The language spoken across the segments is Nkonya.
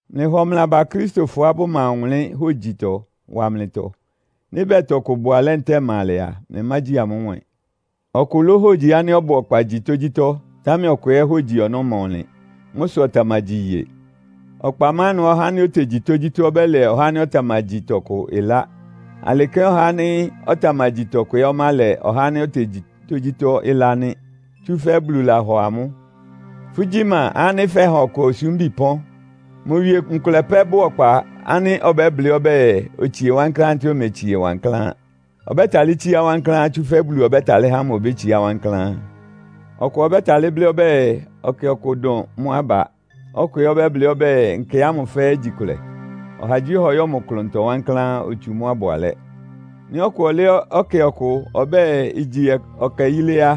Mlɩhɔ mlɩ aba Akristofɔá bʋma ɔwʋnlɩ́n hógyitɔ wa mlɩtɔ. Nɩ́ bɛɛ tɔkʋ bʋ alɛ́ ntɛ́ɛ ɩma alɛ a, mlɩmágyi amʋ́ nwɛ́ɛn. Ɔkʋ lóhogyi ánɩ́ ɔbʋ ɔkpa gyi tógyítɔ́, támɛ ɔkʋ ɛ́ hógyi ɔnɔ́ ɩma ɔnlɩn. Mʋ́ sʋ ɔtamagyi iye. Ɔkpa má ɩnʋá ɔhá ánɩ́ otegyi tógyítɔ́ ɔbɛ́lɛ ɔhá ánɩ́ ɔtamagyi tɔkʋ ɩlá. Alɩ kɛ́n ɔhá ánɩ́ ɔtamagyi tɔkʋ ɛ́ ɔmálɛ ɔhá ánɩ́ otegyi tógyítɔ́ ɩlá nɩ́. Tsúfɛ́ Bulu lahɔ amʋ́. Fʋ́gyí ma ánɩ́ fɛ́ha ɔkʋ osúmbi pɔ́n? Mʋ wie nkʋlɛ pɛ́ bʋ́ʋ ɔkpa ánɩ́ ɔbɛ́blɩ́ ɔbɛ́ɛ, otsie wankláán ntɛ́ɛ ometsie wankláán. Ɔbɛ́talɩ́ tsíá wankláán, tsúfɛ́ Bulu ɔbɛ́talɩ́ há mʋ obétsiá wankláán. Ɔkʋ ɔbɛ́talɩ́ blɩ́ ɔbɛ́ɛ, ɛkɛ kʋ dʋn mʋ́ aba, ɔkʋ ɛ́ ɔbɛ́blɩ́ ɔbɛ́ɛ nkɛ ámʋ fɛ́ɛ́ igyi kʋlɛ. Ɔhagyíɔha ɔyɔ́ mʋ klʋntɔ wankláán, otsu mʋ́á ɩbʋ alɛ́. Nɩ́ ɔkʋ ɔlɛ́ ɛkɛ ɔkʋ ɔbɛ́ɛ igyi ɛkɛ yílé á,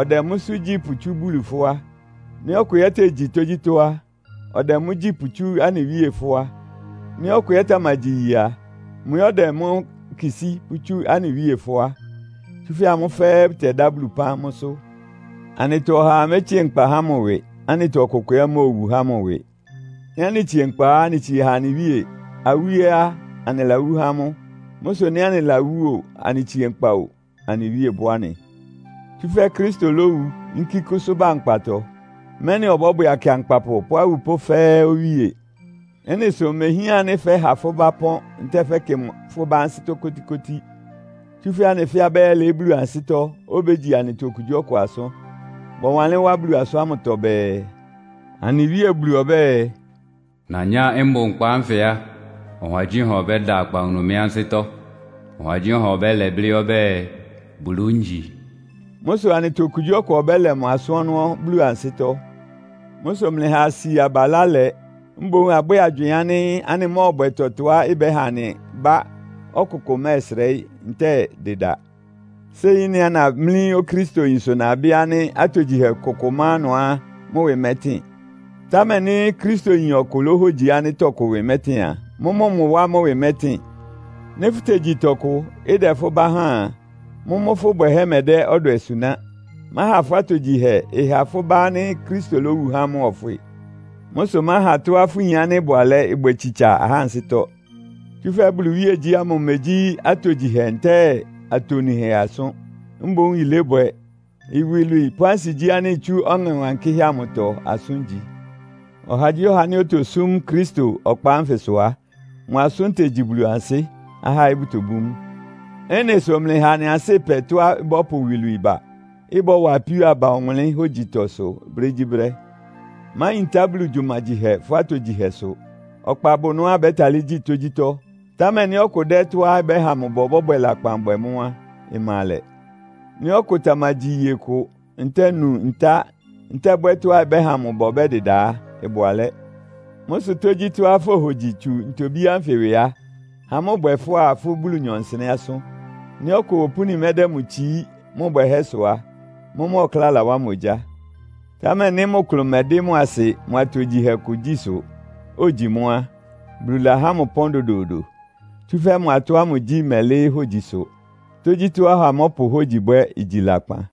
ɔdɛ mʋ́sʋ́ gyí pʋtsú Bulu fʋ́á. Nɩ́ ɔkʋ ɛ́ tegyi tógyítɔ́ á, ɔdɛ mʋ́ gyí pʋtsú anɩ Wíe fʋ́á. Nɩ́ ɔkʋ ɛ́ tamagyi iye a, mʋ ɛ́ ɔdɛ mʋ́ kisí pʋ́tsú anɩ Wíe fʋ́á. Tsúfɛ́ amʋ́ fɛ́ɛ́ bʋtɛdá Bulu ɩpán mʋ́sʋ́. Anɩtɔ ɔhaa métsíe nkpa há mʋ ɩwɩ, anɩtɔ ɔkʋkʋ ɛ́ móowu há mʋ ɩwɩ. Nɩ́ anɩtsie nkpa á, anɩtsie ha anɩ Wíe. Awú ɛ́ á, anɩlawú há mʋ. Mʋ́ sʋ nɩ́ anɩlawú o, anɩtsie nkpa o, anɩ Wíe bʋ́ anɩ. Tsúfɛ́ Kristo lówu, yínkí kʋ́sʋ́ ba nkpatɔ, mɛ́nɩ ɔbɔ́bwɛ akɩankpapʋ pʋ́ awupʋ́ fɛ́ɛ́ Owíe. Ɩ́nɩ sʋ imehián ánɩ́ fɛ́ha fʋ́ bá ɩpɔ́n ntɛ́ɛ fɛ́kɩ fʋ́ bá ansɩ́tɔ́ kótíkótí. Tsúfɛ́ anɩ fɛ́ɛ́ abɛ́yɛ́lɩɩ́ Bulu ansɩ́tɔ́, obégyi anɩtɔ okugyíɔkʋ asʋ́n. Bɔwanlɩ́n wá Bulu asʋ́n ámʋtɔ bɛɛ, “Anɩ Wíe Bulu ɔbɛ́ɛ, ‘Nanyá mbʋ nkpa ánfɩ á, ɔhagyíɔha ɔbɛ́da akpawunu mɩ́ ansɩ́tɔ́; ɔhagyíɔha ɔbɛ́lɛ blɩ́ ɔbɛ́ɛ, Bulu ngyi.’” Mʋ́ sʋ anɩtɔ okugyíɔkʋ ɔbɛ́lɛ mʋ asʋ́n ɔnɔ́ Bulu ansɩ́tɔ́. Mʋ́ sʋ mlɩha asi aba ɩlá lɛ. Mboún abwɛ́ɛ agywɩɩn ánɩ́ anɩmɔ́ɔbwɛ tɔtɔá ɩbɛ́ha anɩ bá ɔkʋkʋ mɛ́ɛsrɛɩ́ ntɛ́ɛ dɩda. Séi ɩ́nɩá namlí Okristoyin sʋ nabɩ́ ánɩ́ atogyihɛ kʋkʋ má ɩnʋá mʋ ɩwɩ mɛtɩn. Támɛ nɩ́ Kristoyin ɔkʋ lóhógyi ánɩ́ tɔkʋ ɩwɩ mɛtɩn a, mʋ́mʋ́ mʋ wá mʋ́ ɩwɩ mɛtɩn. Nɩ́ fʋ́tegyi tɔkʋ, ɩdɛ fʋ́ bá háan a, mʋ́mʋ́ fʋ́ bwɛhɛ́ mɛdɛ́ ɔdwɛ suná. Máha fʋ́ atogyihɛ ɩha fʋ́ bá ánɩ́ Kristo lówu há mʋ ɔfwɩ. Mʋ́ sʋ máha tɔ́á fʋyin ánɩ́ ɩbʋ alɛ́ ɩbwɛ tsitsa ahá ansɩ́tɔ́. Tsúfɛ́ Bulu iwíegyí ámʋ imegyí atogyihɛ ntɛ́ɛ atonuhɛ asʋ́n, mboún yilébwɛ, iwilwii pʋ́ ansigyí ánɩ́ itsú Ɔŋɛ Wankɩ́hɛ́ amʋtɔ asʋ́n igyi. Ɔhagyíɔha ánɩ́ otosúm Kristo ɔkpa ánfɩsʋ á, mʋ asʋ́n tegyi Bulu ansɩ́. Ahá ɛ́ bʋtobú mʋ. Ɩ́nɩ sʋ mlɩha anɩ ansɩ́ ɩpɛ tɔ́á ɩbɔ́pʋ iwilwii ba, ɩbɔ́wa apíó aba ɔwʋnlɩ́n hógyitɔsʋ brégyíbrɛ́. Máyintá Bulu gyumagyihɛ fʋ́ atogyihɛ sʋ. Ɔkpa bʋ ɩnʋá abɛ́talɩ́ gyi tógyítɔ́, támɛ nɩ́ ɔkʋ dɛ́ tɔ́á ɩbɛ́ha mʋ ba ɔbɔ́bwɛ lakpan bwɛ mʋ́ á, ɩma alɛ. Nɩ́ ɔkʋ tamagyi iye kʋ, ntɛ́ɛ nu ntá ntɛ́ɛ bwɛ́ tɔ́á ɩbɛ́ha mʋ ba ɔbɛ́dɩda á, ɩbʋ alɛ́. Mʋ́ sʋ tógyítɔ́á fohogyi tsu ntobí ánfɩ ɩwɩ á, ha mʋ́ ɩbwɛ fʋ́á fʋ́ Bulunyɔ nsɩnɛ́ asʋ́n. Nɩ́ ɔkʋ opúni mɛdɛ́ mʋ tsií mʋ bwɛhɛ́sʋ́ á, mʋ́mʋ́ ɔkláa lawá mʋ ogyá. Támɛ nɩ́ mʋ klʋn mɛdɩ́ mʋ asɩ mʋ atogyihɛ kʋ gyí sʋ, ogyi mʋ́ á, Bulu lahá mʋ ɩpɔ́n dodoodo. Tsúfɛ́ mʋ atɔ́ ámʋ gyí mɛlɩ́ɩ́ hógyisʋ. Tógyítɔ́á ɔha mɔ́pʋ hógyi bwɛ́ igyi lakpan.